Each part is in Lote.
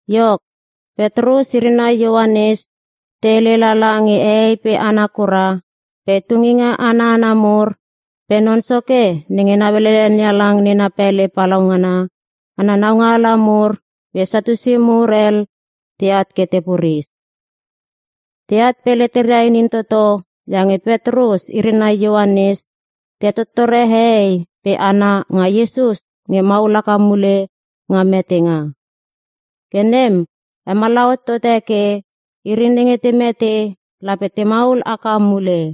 Iok, Petrus iri nai Ioanes te hele lala nge hehei pe hana kura pe tunginga ana hana mur pe non soke nenge nauelele NeHalang nena pele palaungana ana naungaala mur pe Satiusi mur hel teat ke te puris. Teat pe leteria inin toto iange Petrus iri nai Ioanes te hetottore hehei pe hana nga Iesus nge maul haka mule nga metenga. Ke nem hemallaha hot tote ke, iri nenge te mete lape te maul haka mule.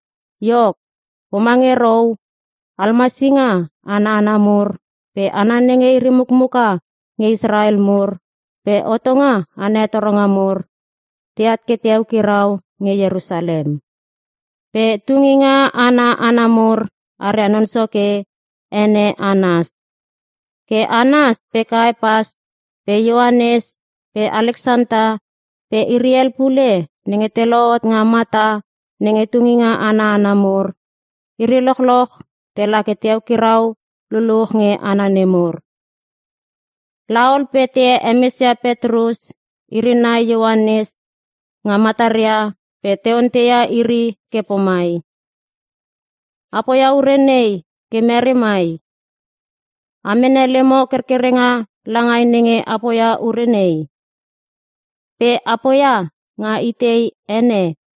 Iok, pomange rou almasinga ana hana mur pe hana nenge iri mukmuka nge Israel mur pe hotonga ana hetoronga mur, teat ke te eukirau nge Ierusalem. Pe tunginga ana hana mur aria non soke, ene Anas. Ke Anas pe Kaepas pe Ioanes pe Aleksanta pe iri hel pule nenge te lohot nga mata nenge tunginga ana hana mur, iri lochloch tela ke te eukirau luluch nge hana nemur. Laol pe te hemesia Petrus iri nai Ioanes nga mataria pe te onteia iri ke pomai, “A poia ure nei ke mere mai? A mene lemo kerkerenga langai nenge a poia ure nei? Pe a poia nga itei ene?”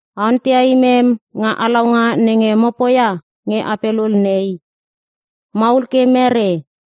A onteia imem nga halaunga nenge mo poia nge ape lul nei. Maul ke mere?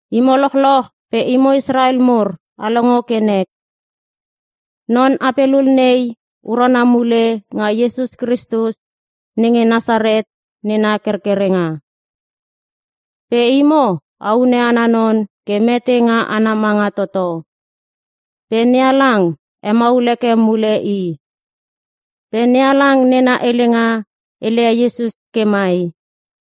Imo lochloch pe imo Israel mur a longo ke nek. Non ape lul nei urana mule nga Iesus Kristus nenge Nasaret nena kerkerenga. Pe imo a hune ana non ke mete nga ana manga toto. Pe NeHalang hemaul heke mule i. Pe NeHalang nena helenga hele ia Iesus ke mai: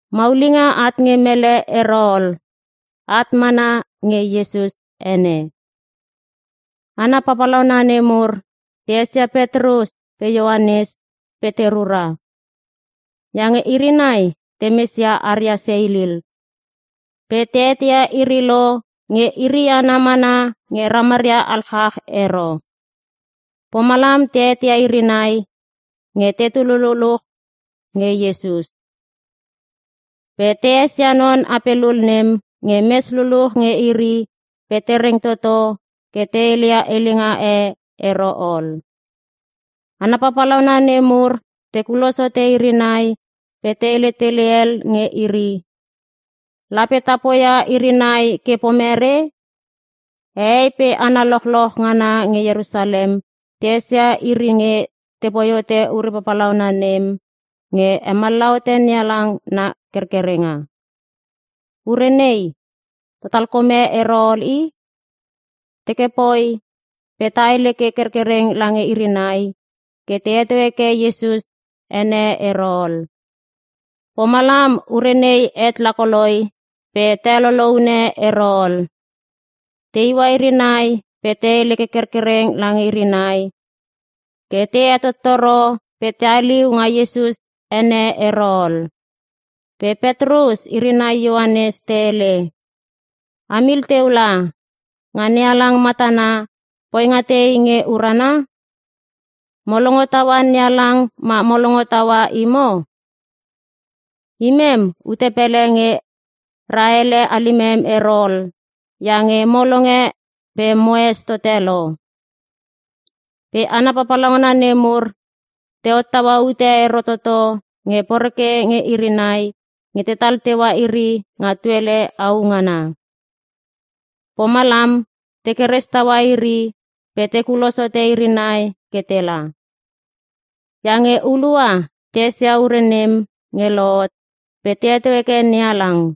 Maulinga at nge mele ero ol. At mana nga Iesus ene.” Hana papalauna nemur te esia Petrus pe Ioanes pe te rura. Iange iri nai temes ia aria seilil. Pe te eteia iri lo, nge iri hana mana nge ramaria alchach ero. Pomalam te eteia iri nai nge tetu luluch nge Iesus. Pe te esia non ape lul nem nge mes luluch nge iri pe te reng toto ke te hele ia helenga e ero ol. Hana papalauna nemur te kulos hote iri nai pe te hele tele el nge iri, “Lape ta poia iri nai ke pomere? Hehei pe hana lochloch ngana nge Ierusalem te esia iri nge tepoi hote ure palaungana nem nge hemallaha hote NeHalang na hekerkerenga. Ure nei, ta talkome ero ol i! Teke poi, pe ta hele ke kerkereng lange iri nai ke te heto heke Iesus ene ero ol. Pomalam ure nei het la koloi pe te heloloune ero ol.” Te iua iri nai pe te hele ke kerkereng lange iri nai ke te hetottoro pe te haliu nga Iesus ene ero ol. Pe Petrus iri nai Ioanes te hele, “A mil teu la. Nga NeHalang matana, poinga tei nge urana? Mo longo taua NeHalang ma mo longo taua imo? Imem, ute pele nge ra ele halimem ero ol iange mo longe pe moes tote lo.” Pe hana papalauna nemur te hottaua ute ero toto nge poreke nge iri nai nge tetal teua iri nga tuele au ngana. Pomalam, te keres taua iri pe te kulos hote iri nai ke tela. Iange hulua te esia ure nem nge lohot pe te heto heke NeHalang.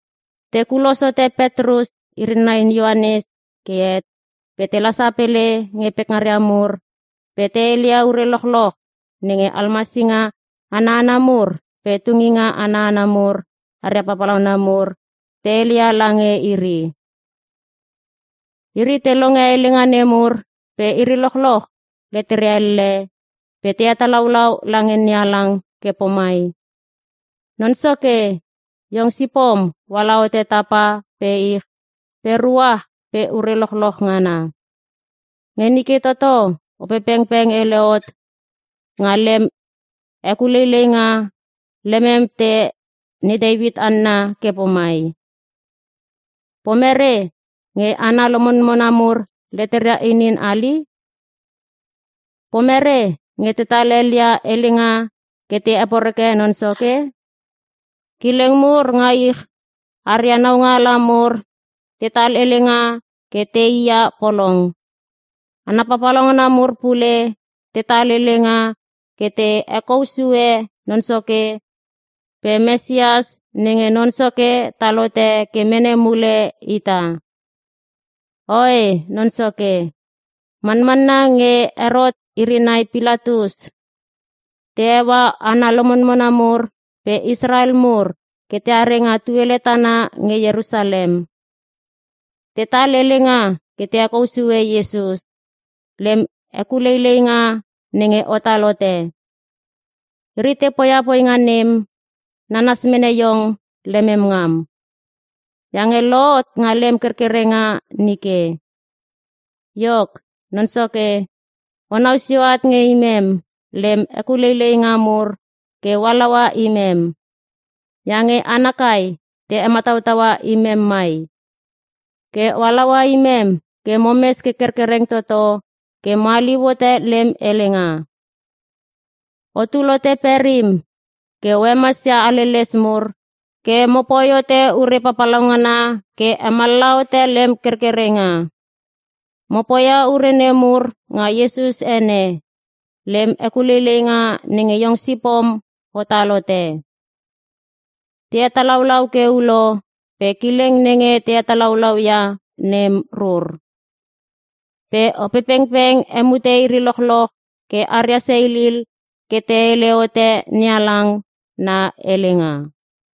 Te kulos hote Petrus iri nai Ioanes ke het pe tela sapele nge pekngaria mur pe te heleia ure lochloch nenge almasinga ana hana mur pe tunginga ana hana mur aria papalauna mur te hele ia lange iri. Iri te longe helenga nemur pe iri lochloch leteria elle pe te hetalaulau lange NeHalang ke pomai, “Non Soke, iong sipom oala hote tapa pe ich pe ruach pe ure lochloch ngana. Nge nike toto, Opepengpeng hele hot nga lem hekuleileinga, lemem te ne Teuit hanna ke pomai: “‘Pomere nge hana lomonmona mur leteria inin hali? Pomere nge tetal hel ia helenga ke te heporeke Non Soke? Kileng mur nga ich aria naungaala mur tetal helenga ke tei ia polong. Hana papalauna mur pule tetal helenga ke te hekou sue Non Soke pe Mesias nenge Non soke tal hote ke mene mule ita.’ Oe Non Soke. Manmanna nge Herot iri nai Pilatus te heua hana lomonmona mur pe Israel mur ke teare nga tuele tana nge Ierusalem. Tetal helenga ke te hekou sue Iesus, lem hekuleileinga nenge otal hote. Iri te poia poinga nem, nanas mene iong lemem ngam. Iange lohot nga lem kerkerenga nike. Iok, Non Soke o nau sio at nge imem, lem hekuleileinga mur ke o halaua imem. Iange hana kai te hemataua imem mai. Ke o halaua imem ke momes ke kerkereng toto ke mo haliu hote lem helenga. Otul hote perim ke mo hemasia haleles mur pe mopoi hote ure papalauna ke hemallaha hote lem kerkerenga. Mo poia ure nemur nga Iesus ene, lem hekuleileinga nenge iong sipom otal hote.” Te hetalaulau ke ulo, pe kileng nenge te hetalaulau ia nem rur. Pe Opepengpeng hemute iri lochloch ke aria seilil ke te hele hote NeHalang na helenga.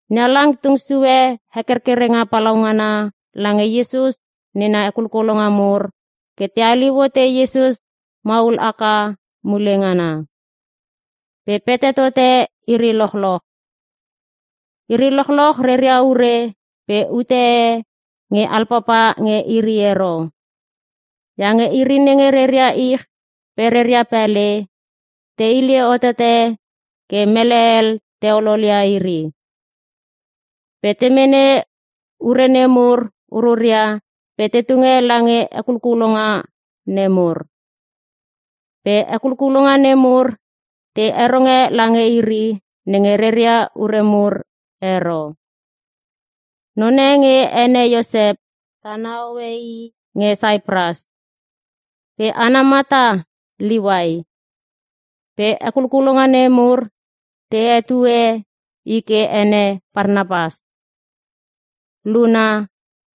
NeHalang tung sue hekerkerenga palaungana lange Iesus nena hekulkulonga mur ke te haliu hote Iesus maul haka mule ngana. Pe pete tote iri lochloch. Iri lochloch reria ure pe ute e nge alpapa nge iri ero. Iange iri nenge reria ich pe reria pele, te hile hotote ke mele hel te ololia iri. Pe te mene ure nemur ururia pe te tunge lange hekulkulonga nemur. Pe hekulkulonga nemur te heronge lange iri nenge reria ure mur ero. None nge ene Iosep, tana hoe i nge Saipras. Pe ana mata, Liuai. Pe hekulkulonga nemur te hetue i ke ene Parnapas. (Luna,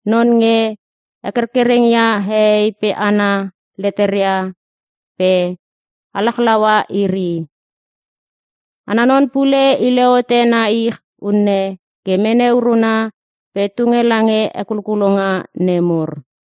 non nge hekerkereng ia hehei pe hana leteria pe halachlaua iri.) Ana non pule hile hote na ich unne ke mene uruna pe tunge lange hekulkulonga nemur.